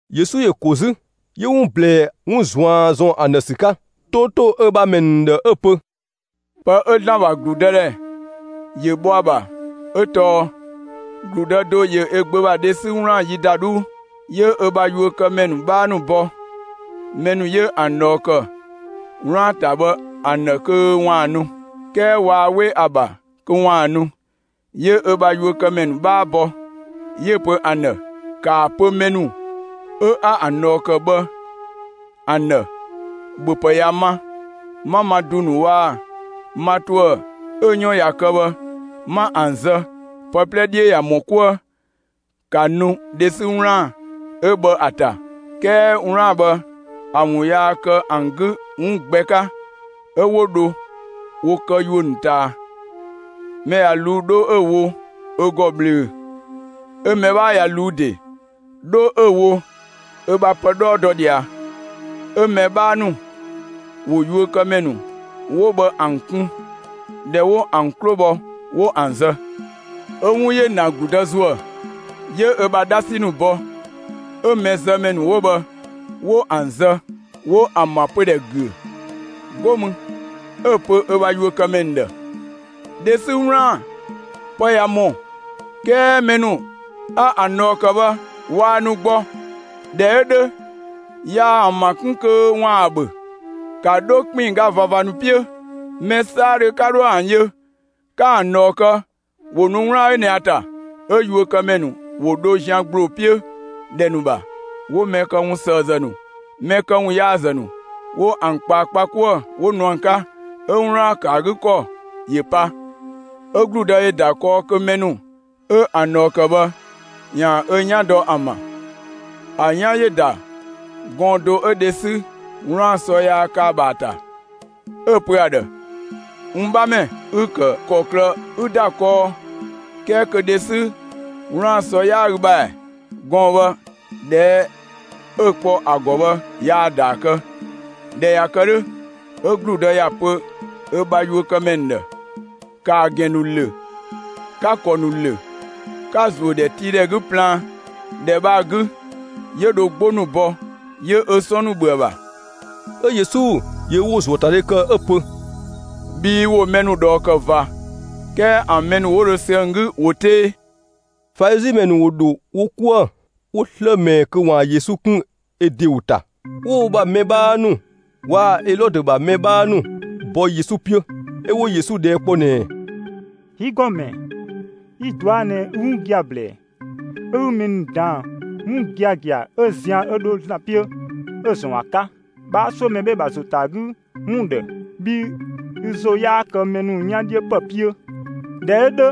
Yesu ‑yö ‑ko 'zü, 'yö 'wun ꞊blɛɛ 'wun ꞊zuan' ‑zɔn ‑an ‑dhë ‑sü 'ka, 'to ‑to ö ‑bha ‑mɛ ‑nu ‑dhë 'ö‑ pö: «Pë 'ö ‑Zlan ‑bha ‑gludëdhɛ ‑yö bhɔ ‑a ‑bha 'ö tɔɔ: ‑Gludë do ‑yö ö gbö ‑bha dhe 'sü 'wlaan‑ yi ‑da 'dhuu. 'Yö ö bha yuökëmɛ ‑nu 'bhaa bɔ mɛ ‑nu 'yö ‑an ꞊dhɔɔ ‑kë 'wlaan‑ ‑ta bhë ‑an ‑dhë kö ‑waan nu. 'Kɛɛ waa 'we ‑a ‑bha kö ‑waan nu. 'Yö ö bha yuökëmɛ ‑nu 'bhaa bɔ, 'yö‑ pö ‑an ‑dhë: ‹‑Kaa pö mɛ ‑nu 'a ‑an ꞊dhɔɔ ‑kë bhë ‑an ‑dhë: ‑Bhöpë ꞊ya ma; 'ma ma ‑du ‑nu waa‑ ma ‑tuë 'ö‑ 'yɔn ꞊ya kë bhë, 'ma ‑an zë, pë 'plɛ 'dhiö ꞊ya ‑mɔ 'kuë; ‑ka nu dhe 'sü 'wlaan‑ 'ö bhë ‑a ‑ta!› 'Kɛɛ 'wlaan‑ bhë ‑a ‑wun yaa kë ‑an 'gü 'wun gbɛ 'ka, 'ö 'wo dho wo kë yuö ‑nu ꞊taa. Mɛ ꞊ya ꞊luu'‑, 'dho 'ö‑ wo ö ‑gɔ ꞊bhlöö‑, 'ö‑ mɛ 'bhaa ꞊ya ꞊luu'‑ ‑de, 'dho 'ö‑ wo ö bha pë 'dhɔɔ dɔ ꞊dhia. 'Ö‑ mɛ 'bhaa ‑nu ‑wo yuökëmɛ ‑nu 'wo bhë ‑an kun. ꞊Dhɛ 'wo ‑an 'klo bhɔ, 'wo ‑an zë. 'Ö 'wun ‑yö ‑na ‑gludë ‑zuë, 'yö ö bha 'dhasi ‑nu bɔ, 'ö mɛzëmɛ ‑nu 'wo bhë 'wo ‑an zë, 'wo ‑an ‑bha pödhɛ ‑güö. 'Go mü 'ö‑ pö ö bha yuökëmɛ ‑nu ‑dhë: ‹Dhe 'sü 'wlaan‑ ‑pë ꞊ya ‑mɔ, 'kɛɛ mɛ ‑nu 'a ‑an ꞊dhɔɔ ‑kë bhë, waa nu gbɔ. ꞊Dhɛ 'ö 'dhö, yaa ‑an ‑bha 'kun kö ‑waan ‑a ‑bhö. ‑Ka 'dho ‑kpinngga ꞊vava ‑nu 'piö, mɛ 'saadhö 'ka 'dhoë‑ ‑an yö, ‑ka ‑an ꞊dhɔɔ kë, ‑wo nu 'wlaan‑ 'ö ꞊nɛ ‑a ‑ta!› 'Ö yuökëmɛ ‑nu ‑wo dho zian ‑gbloo 'piö ‑dhɛ ‑nu ‑bha, 'wo mɛ këwunsëëzë ‑nu, mɛ këwunyaazë ‑nu, 'wo ‑an ꞊kpaa kpa 'kuë‑, 'wo nu ‑an 'ka, 'ö 'wlaan‑ ‑kë ‑a 'gü ‑kɔ ‑yö pa. 'Ö ‑gludë ‑yö ‑da kɔɔ kö mɛ ‑nu 'ö ‑an ꞊dhɔɔ ‑kë bhë, ‑yaan ö 'yan dɔ ‑an ‑bha. ‑A 'yan ‑yö ‑da gɔɔn‑ do 'ö dhe 'sü 'wlaan‑ ‑sɔ yaa kë ‑a ‑bha ‑a ‑ta. 'Ö‑ pö ‑a ‑dhë: ‹N 'bhamɛ, ü‑ ‑kë ‑kɔklë 'ü ‑da kɔɔ, 'kɛɛ kö dhe 'sü 'wlaan‑ ‑sɔ 'yaa ü ‑bha ‑ɛ?› Gɔɔn‑ bhë, ꞊dhɛɛ' 'ö kpɔ ‑a ‑gɔ bhë, yaa‑ ‑daa kë. ꞊Dhɛ ꞊ya kë 'dhö, 'ö ‑gludë ‑ya pö ö bha yuökëmɛ ‑nu ‑dhë: ‹‑Ka ‑a ‑gɛn ‑nu ‑lö, 'ka‑ ‑kɔ ‑nu ‑lö, 'ka‑ ‑zuö ‑dhɛtiidhɛ 'gü plaan, ‑dhɛ bhë ‑a 'gü, 'yö dho 'gbo ‑nu bɔ, 'yö ö 'sɔn ‑nu ‑bhö ‑a ‑bha.›» 'Ö Yesu ‑yö ö ‑wo ‑zuöatadhe ‑kë 'ö‑ pö: «Bhii ‑wo mɛ ‑nu ꞊dhɔɔ ‑kë ꞊va, 'kɛɛ ‑an mɛ ‑nu 'wo dho sü ‑an 'gü ꞊wo 'tee.» Falizi ‑mɛ ‑nu ‑wo ‑dho wo 'kuë‑, 'wo 'slë ꞊mɛɛ kö ‑waan Yesu 'kun ö ‑de ‑wo ‑ta. 'Ö 'wo wo ‑bha mɛ 'bhaa ‑nu waa‑ Elɔdö ‑bha mɛ 'bhaa ‑nu bɔ Yesu 'piö, 'ö 'wo Yesu ꞊dhɛɛ' kpɔ ꞊nɛɛ: «Yi ‑Gɔmɛ, yi‑ ꞊dɔa' ꞊nɛ ü 'wun gia‑ ‑blɛɛ, 'ö 'ü mɛ ‑nu ‑daan 'wun giagia 'ö zian 'ö dho ‑Zlan 'piö 'ö‑ ‑zɔn ‑a 'ka; 'bhaa 'suö mɛ 'bhee‑ ‑bha ‑zo ‑ta ‑a 'gü ‑wun ‑dhë, bhii ü ‑zo 'yaa kë mɛ ‑nu 'yan 'dhiö ‑pë 'piö. ꞊Dhɛ 'ö 'dhö,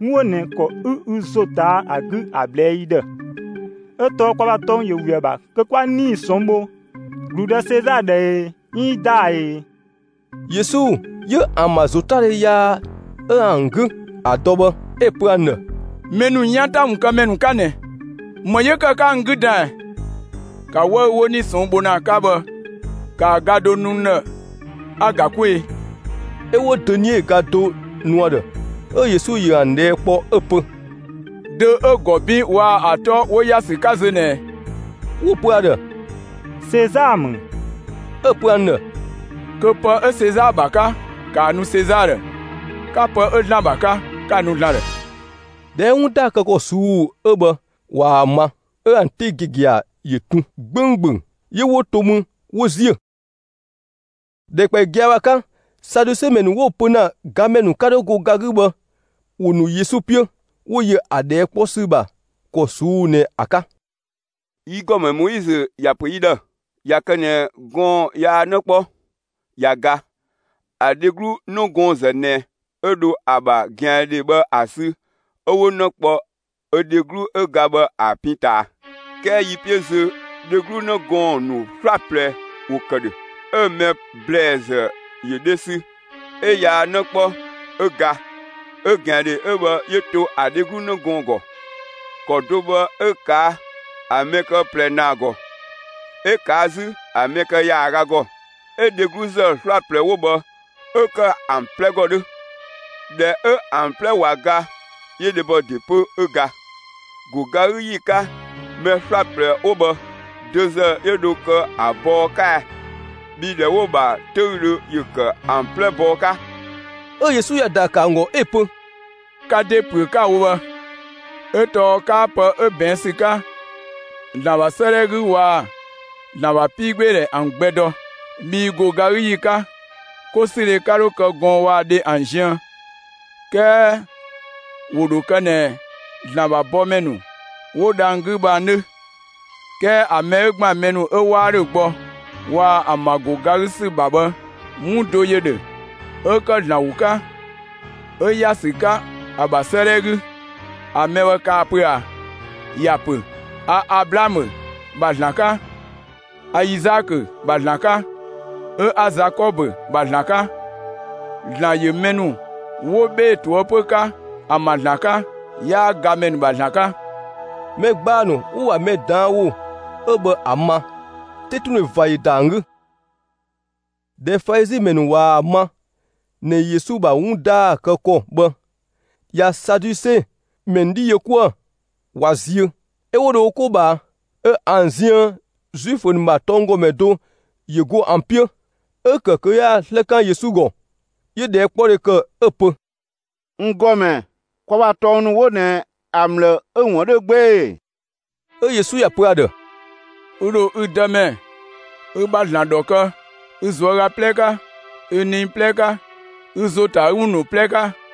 'wun 'ö ꞊nɛ ‑kɔ 'ü ü ‑zo ꞊taa' ‑a 'gü ‑a ꞊blɛɛ'‑ yi ‑dhë, 'ö tɔɔ kwa ‑bha tɔng ‑yö ‑we ‑a ‑bha kö 'kwa 'nii‑ ꞊sɔnng' bho ‑gludë Sezaa ‑dhë ee, 'iin ‑daa ee?» Yesu 'yö ‑an ‑bha ‑zotadhe yaa 'ö ‑an 'gü ‑a ‑dɔ bhë, 'ö‑ pö ‑an ‑dhë: «Mɛ ‑nu 'yan ‑ta ‑wun kë ‑mɛ ‑nu 'ka ꞊nɛ! ‑Më 'yö ‑kë 'ka n 'gü dan ꞊ɛ? ‑Ka 'wëü‑ 'wo 'nii‑ ꞊sɔnng' bho ‑na ‑a 'ka bhë, ‑kaa do nu n ‑dhë 'a‑ ‑ga 'kwee‑!» 'Ö 'wo dönie ga do nu ‑a ‑dhë. 'Ö Yesu ‑yö ‑an ꞊dhɛɛ' kpɔ 'ö‑ pö: «Dö 'ö‑ ‑gɔ 'bin waa‑ ‑a 'tɔ 'wo ‑ya ‑sü 'ka zö ꞊nɛ ꞊ɛ?» 'Wo‑ pö ‑a ‑dhë: «Sezaa ‑mü.» 'Ö‑ pö ‑an ‑dhë: «Kö pë 'ö Sezaa ‑bha 'ka, ‑ka ‑a nu Sezaa ‑dhë; 'ka pë 'ö ‑Zlan ‑bha 'ka, 'ka‑ nu ‑Zlan ‑dhë!» ꞊Dhɛ 'ö 'wun ‑daa ꞊suu'‑ kë ‑kɔ 'ö bhë ꞊waa‑ ma, 'ö ‑an 'te giagia ‑yö tun 'gbönggböng, 'yö 'wo‑ to mü, 'wo ‑ziö. ‑Dhɛkpaɔyi gia‑ bhë ‑a 'ka, Saduse ‑mɛ ‑nu 'wo‑ pö ‑na gamɛ ‑nu 'ka dho go ga 'gü bhë, ‑wo ‑nu Yesu 'piö, 'wo yö ‑a ꞊dhɛɛ' 'kpɔ ‑sü ‑bha ‑kɔ ꞊suu'‑ ꞊nɛ ‑a 'ka: «Yi ‑Gɔmɛ, Moizö ‑ya ‑pö yi ‑dhë: ‹꞊Ya kë ꞊nɛ gɔɔn‑ yaa 'në 'kpɔ, ꞊ya ga, ‑a dheglu 'nëgɔɔnzë ꞊nɛ 'ö dho ‑a ‑bha ꞊gɛandhe bhë ‑a sü, 'ö 'wo 'në kpɔ ö dheglu 'ö ga bhë ‑a pin ꞊taa.› 'Kɛɛ yi 'piö zö dheglu 'në gɔɔn‑ ‑nu 'slaplɛ ‑wo ‑kë ‑dhö, 'ö‑ mɛ ‑blɛɛzë ‑yö dhe sü, 'ö yaa 'në 'kpɔ 'ö ga, 'ö ꞊gɛandhe 'ö bhë 'yö to ‑a dheglu 'në gɔɔn‑ ‑gɔ. ‑Kɔ do bhë 'ö ꞊kaa' ‑a mɛ kë ꞊plɛ ‑naa ‑gɔ; 'ö ꞊kaa' 'zü ‑a mɛ kë ‑yaaga ‑gɔ, 'ö dhegluzë 'slaplɛ 'wo bhë 'ö ‑kë ‑an 'plɛ ‑gɔ 'dhö. ꞊Dhɛ 'ö ‑an 'plɛ ꞊wa ga, 'yö dhebɔ ‑de 'pö, 'ö ga. ‑Go ga 'gü ‑yi 'ka, mɛ 'slaplɛ 'wo bhë, dö ‑zë 'yö dho kë ‑a bɔɔ 'ka ɛ? Bhii ‑dhɛ 'wo‑ ‑bha 'töüdhö ‑yö ‑kë ‑an 'plɛ bɔɔ 'ka.» 'Ö Yesu ‑ya ‑daa ‑kë ‑an ‑gɔ 'ö‑ pö: «Ka ‑de ‑püö 'ka ‑a wo bhë, 'ö tɔɔ 'kaa pë 'ö ꞊bɛɛn' ‑sü 'ka ‑Zlan ‑bha 'sëëdhɛ 'gü waa‑ ‑Zlan ‑bha 'piigbeedhɛ ‑an gbɛ dɔ. Bhii ‑go ga 'gü ‑yi 'ka, 'kosüdhe 'ka 'dho kë gɔɔn‑ waa‑ dhe ‑an ziën, 'kɛɛ ‑wo ‑dho kë ꞊nɛ ‑Zlan ‑bha bɔmɛ ‑nu 'wo dhang‑ 'gü bhë ‑an 'dhö. 'Kɛɛ ‑a mɛ 'ö ‑gban mɛ ‑nu 'ö 'waa ‑dhö gbɔ waa‑ ‑an ‑bha ‑go ga 'gü ‑sü ‑bha bhë, 'wun do ‑yö ‑dhö 'ö ‑kë ‑Zlan ‑wo 'ka, 'ö ‑ya ‑sü 'ka ‑a ‑bha 'sëëdhɛ 'gü. ‑A mɛ bhë kaa‑ pö ꞊a? ‑Ya ‑pö: A Ablaamö ‑bha ‑Zlan 'ka, a Izaakö ‑bha ‑Zlan 'ka, 'ö 'a Zakɔbö ‑bha ‑Zlan 'ka. ‑Zlan ‑yö mɛ ‑nu 'wo 'bhee‑ ꞊toëpö 'ka ‑an ‑bha ‑Zlan 'ka, 'yaa gamɛ ‑nu ‑bha ‑Zlan 'ka.» Mɛ ‑gbaa ‑nu 'wo‑ ‑bha mɛ ꞊daan' ‑wo 'ö bhë ‑a ma, 'tetundhe ꞊va ‑yö ‑da ‑an 'gü. ꞊Dhɛ Falizi ‑mɛ ‑nu ꞊waa‑ ma ꞊nɛ Yesu ‑bha 'wun ‑daa kë ‑kɔ bhë ꞊ya Saduse ‑mɛ ‑nu 'dhi yö 'kuë‑, ꞊wa ziö, 'ö 'wo dho wo 'ko ꞊bhaa. 'Ö ‑an ziën Zuifö ‑nu ‑bha tɔnggɔmɛ do ‑yö go ‑an 'piö, 'ö‑ ‑kë kö 'yaan‑ 'slë 'kan Yesu ‑gɔ. 'Yö‑ ꞊dhɛɛkpɔdhe ‑kë 'ö‑ pö: «N ‑Gɔmɛ, kwa ‑bha tɔng ‑nu 'wo ꞊nɛ ‑a ‑mlë 'ö‑ ‑wun 'dhö 'gbee‑ ‑e?» 'Ö Yesu ‑ya pö ‑a ‑dhë: «Ü ‑dho ü Dëmɛ, ü ‑bha ‑Zlan, ‑dhɔ kë ü ꞊zuöga 'plɛ 'ka, ü nii 'plɛ 'ka, ü ‑zo ‑ta ‑a 'gü ‑wun ‑nu 'plɛ 'ka!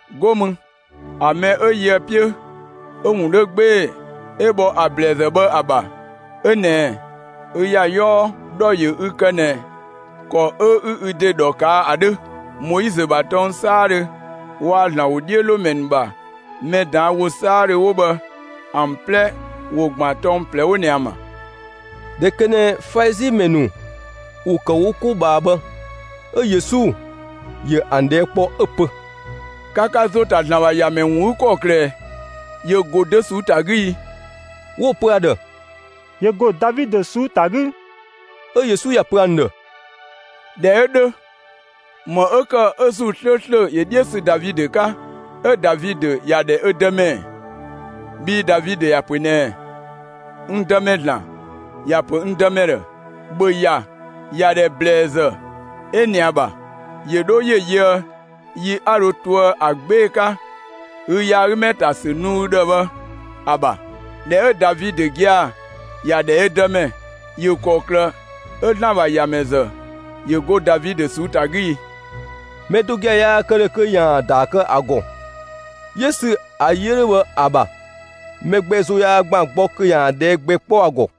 'Go mü ‑a mɛ 'ö yö ‑a 'piö 'ö‑ ‑wun 'dhö 'gbee‑ 'ö bhɔ ‑a ‑blɛɛzë bhë ‑a ‑bha 'ö ꞊nɛɛ: Ü ‑ya 'yɔɔ ‑dhɔ ‑yö ü kë ꞊nɛ ‑kɔ 'ö 'ü ü ‑de ‑dhɔ ꞊kaa' ‑a 'dhö! Moizö ‑bha tɔng 'saadhö waa‑ ‑Zlan ‑wodhiölomɛ ‑nu ‑bha mɛ ꞊daan' ‑wo 'saadhö 'wo bhë ‑an 'plɛ ‑wo ‑gban tɔng ꞊plɛ 'wo ꞊nɛ ‑an ‑bha.» ꞊Dhɛ ‑kë ꞊nɛ Falizi ‑mɛ ‑nu ‑wo ‑kë wo 'ko ꞊bhaa bhë, 'ö Yesu ‑yö ‑an ꞊dhɛɛ' kpɔ, 'ö‑ pö: «Ka ka ‑zo ‑ta ‑Zlan ‑bha ‑Yamɛ ‑wun 'gü ‑kɔklë ꞊ɛ? ‑Yö ‑go dö ꞊suu'‑ ‑ta 'gü i?» 'Wo‑ pö ‑a ‑dhë: «‑Yö ‑go Davidö ꞊suu'‑ ‑ta 'gü.» 'Ö Yesu ‑ya pö ‑an ‑dhë: «꞊Dhɛ 'ö 'dhö, ‑më 'ö ‑kë 'ö ‑Zuu 'slööslö ‑yö 'dhiö sü Davidö 'ka, 'ö Davidö ‑ya ‑dhɛ ö Dëmɛ ‑ɛ? Bhii Davidö ‑ya pö ꞊nɛɛ: N Dëmɛ (‑Zlan), ‑ya pö n Dëmɛ ‑dhë: ‑Bhö ‑ya ‑yadhɛ ꞊bhlëzë 'ö ꞊nɛ ‑a ‑bha, ‑yö ‑dho ‑yö yöë yi 'a dho toë ‑a 'gbee‑ 'ka ü yaagümɛ ‑ta ‑sü nu ü ‑dhë bhë ‑a ‑bha! ꞊Dhɛ 'ö Davidö gia‑ ‑ya ‑dhɛ ö Dëmɛ, ‑yö ‑kɔklë 'ö ‑Zlan ‑bha ‑Yamɛ ‑zë ‑yö go Davidö ꞊suu'‑ ‑ta 'gü i?» Mɛ do gia‑ yaa kë ‑dhö kö ‑yaan ‑a ‑daa kë ‑a ‑gɔ. 'Yö sü ‑a yi 'ö 'dhö bhë ‑a ‑bha, mɛ gbɛ ‑zo yaa ‑gban gbɔ kö ‑yaan ꞊dhɛɛ' gbɛ 'kpɔ ‑a ‑gɔ.